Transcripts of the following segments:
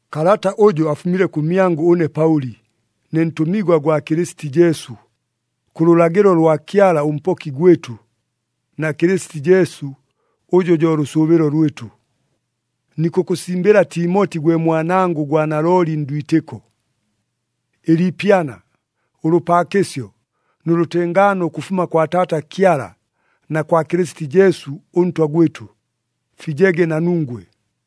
Kalata ʉjʉ afumile kʉmyangʉ ʉne Paʉli, ne ntʉmigwa gwa Kɨlɨsiti Jesu, kʉ lʉlagɨlo lwa Kyala ʉMpoki gwɨtʉ na Kɨlɨsiti Jesu ʉjʉ jo lʉsʉʉbɨlo lwɨtʉ. Nikʉkʉsimbɨla Timoti gwe mwanangʉ gwa nalooli ndwitɨko. Ɨliipyana, ʉlʉpaakɨsyo nʉ lʉtengaano ʉkʉfuma kwa Taata Kyala na kwa Kɨlɨsiti Jesu ʉNtwa gwɨtʉ, fijege na nungwe.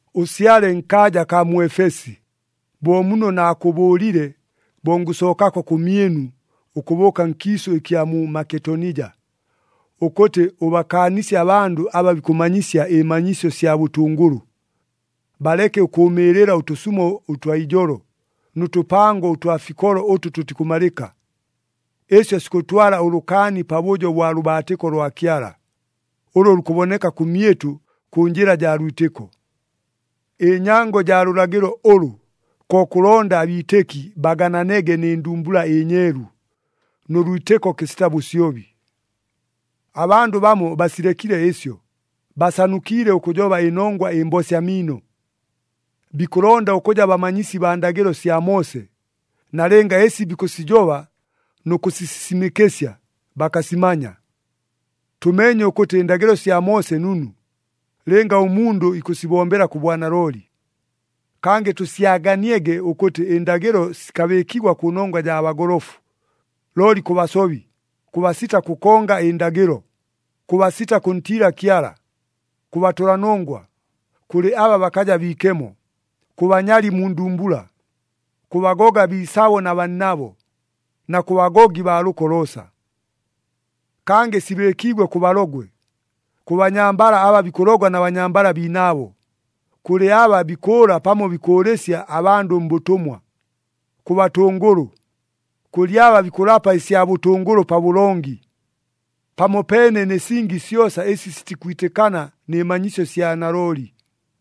Ʉsyale nkaaja akaa mu Efesi, bo muno naakʉbʉʉlile bo ngʉsookako kʉmyɨnu ʉkʉbʉʉka nkiisʉ ɨkya mu Maketonija, ʉkʉtɨ ʉbakaanisye abandʉ aba bikʉmanyisya ɨmanyisyo sya bʉtʉngʉlʉ. Baleke ʉkʉʉmɨɨlɨla ʉtʉsumo ʉtwa ijolo, nʉ tʉpango ʉtwa fikolo ʉtʉ tʉtikʉmalɨka. Ɨsyo sikʉtwala ʉlʉkaani pabʉjo bwa lʉbaatɨko lwa Kyala, ʉlʉ lukʉboneka kʉmyɨtʉ kʉ njɨla jaa lwitɨko. Ɨnyango jaa lʉlagɨlo ʉlʉ ko kʉlonda abiitɨki bagananege nɨ ndumbula ɨnyeelu, nʉ lwitɨko kɨsita bʉsyobi. Abandʉ bamo basilekile ɨsyo, basanukiile ʉkʉjoba ɨnongwa ɨmbosya miino. Bikʉlonda ʉkʉja bamanyisi baa ndagɨlo sya Moose, nalɨnga ɨsi bikʉsijoba nʉ kʉsisisimɨkɨsya bakasimanya. Tʉmeenye ʉkʉtɨ ɨndagɨlo sya Moose nunu, lɨnga ʉmundʉ ikʉsibombela kʉ bwanalooli. Kangɨ tʉsyaganiege ʉkʉtɨ ɨndagɨlo sikabɨɨkigwa kʉnongwa jaa bagolofu, looli kʉ basobi, kʉ basita kʉkonga ɨndagɨlo, kʉ basita kʉntiila Kyala, kʉ batʉlanongwa, kʉlɨ aba bakaja biikemo, kʉ banyali mu ndumbula, kʉ bagoga biisabo na bannabo, na kʉ bagogi baa lʉko loosa. Kangɨ sibɨɨkiigwe kʉ balogwe, kʉ banyambala aba bikʉlogwa na banyambala biinaabo, kʉlɨ aba bikʉʉla pamo bikʉʉlɨsya abandʉ mbʉtʉmwa, kʉ batʉngʉlʉ, kʉlɨ aba bikʉlapa ɨsya bʉtʉngʉlʉ pabʉlongi, pamopeene nɨ singi syosa ɨsi sitikwitɨkana nɨ manyisyo sya nalooli.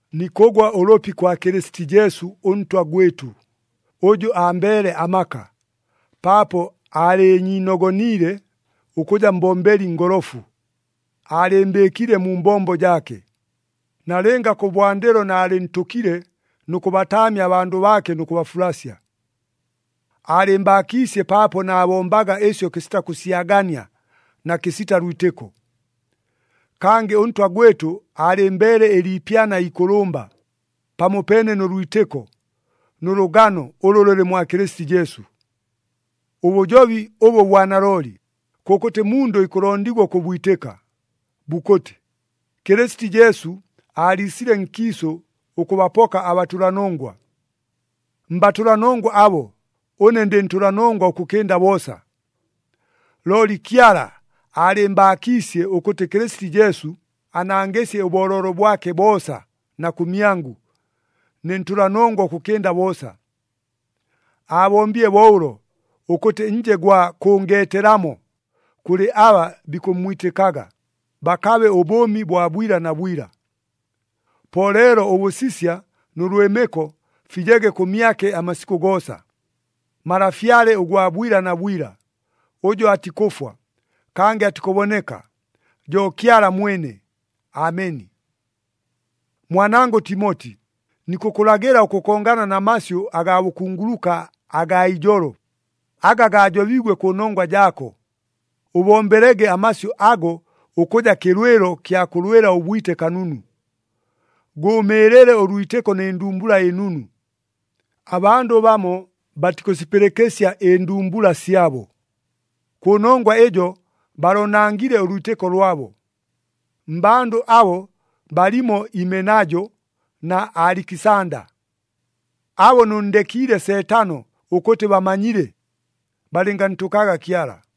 Nikʉgwa ʉlʉpi kwa Kɨlɨsiti Jesu ʉNtwa gwɨtʉ, ʉjʉ ambeele amaka, paapo aalɨɨnyiinogoniile ʉkʉja mbombeli ngolofu. Aalɨɨmbɨɨkile mu mbombo jaake, nalɨnga kʉbwandɨlo naalɨntʉkile nʉ kʉbataamya abandʉ baake nʉ kʉbafulasya. Aalɨmbaakiisye paapo naabombaga ɨsyo kɨsita kʉsyagania na kɨsita lwitɨko. Kangɨ ʉNtwa gwɨtʉ aalɨmbeele ɨliipyana ikʉlʉmba, pamopeene nʉ lwitɨko nʉ lʉgano ʉlʉ lʉlɨ mwa Kɨlɨsiti Jesu. Ʉbʉjobi ʉbʉ bwa nalooli, kʉkʉtɨ mundʉ ikʉlondigwa ʉkʉbwitɨka, bukʉtɨ, “Kɨlɨsiti Jesu aaliisile nkiisʉ ʉkʉbapoka abatʉlanongwa.” Mbatʉlanongwa abo, ʉne ndɨ ntʉlanongwa ʉkʉkɨnda boosa. Looli Kyala aalɨmbaakiisye ʉkʉtɨ Kɨlɨsiti Jesu anangɨsye ʉbooloolo bwake boosa na kʉmyangʉ, ne ntʉlanongwa ʉkʉkɨnda boosa. Aabombile bo ʉlo ʉkʉtɨ nje gwa kʉngeetelamo kʉlɨ aba bikʉmmwitɨkaga, bakabe ʉbʉʉmi bwa bwila na bwila. Po leelo ʉbʉsisya nʉ lwɨmɨko fijege kʉmyake amasikʉ goosa, Malafyale ʉgwa bwila na bwila, ʉjʉ atikʉfwa, kangɨ atikʉboneka, jo Kyala mwene. Ameni. Mwanangʉ Timoti, nikʉkʉlagɨla ʉkʉkongana na masyʉ agaa bʉkunguluka agaa ijolo, aga gaajobiigwe kʉnongwa jaako. Ʉbombelege amasyʉ ago ʉkʉja kɨlwɨlo kya kʉlwɨla ʉbwite kanunu. Gʉʉmɨɨlɨle ʉlwitɨko nɨ ndumbula ɨnunu. Abandʉ bamo batikʉsipɨlɨkɨsya ɨndumbula syabo. Kʉnongwa ɨjo baloonangile ʉlwitɨko lwabo. Mmbandʉ abo balimo Imenajo na Alikisanda. Abo nʉnndekiile Seetano ʉkʉtɨ bamanyile, balɨngantʉkaga Kyala.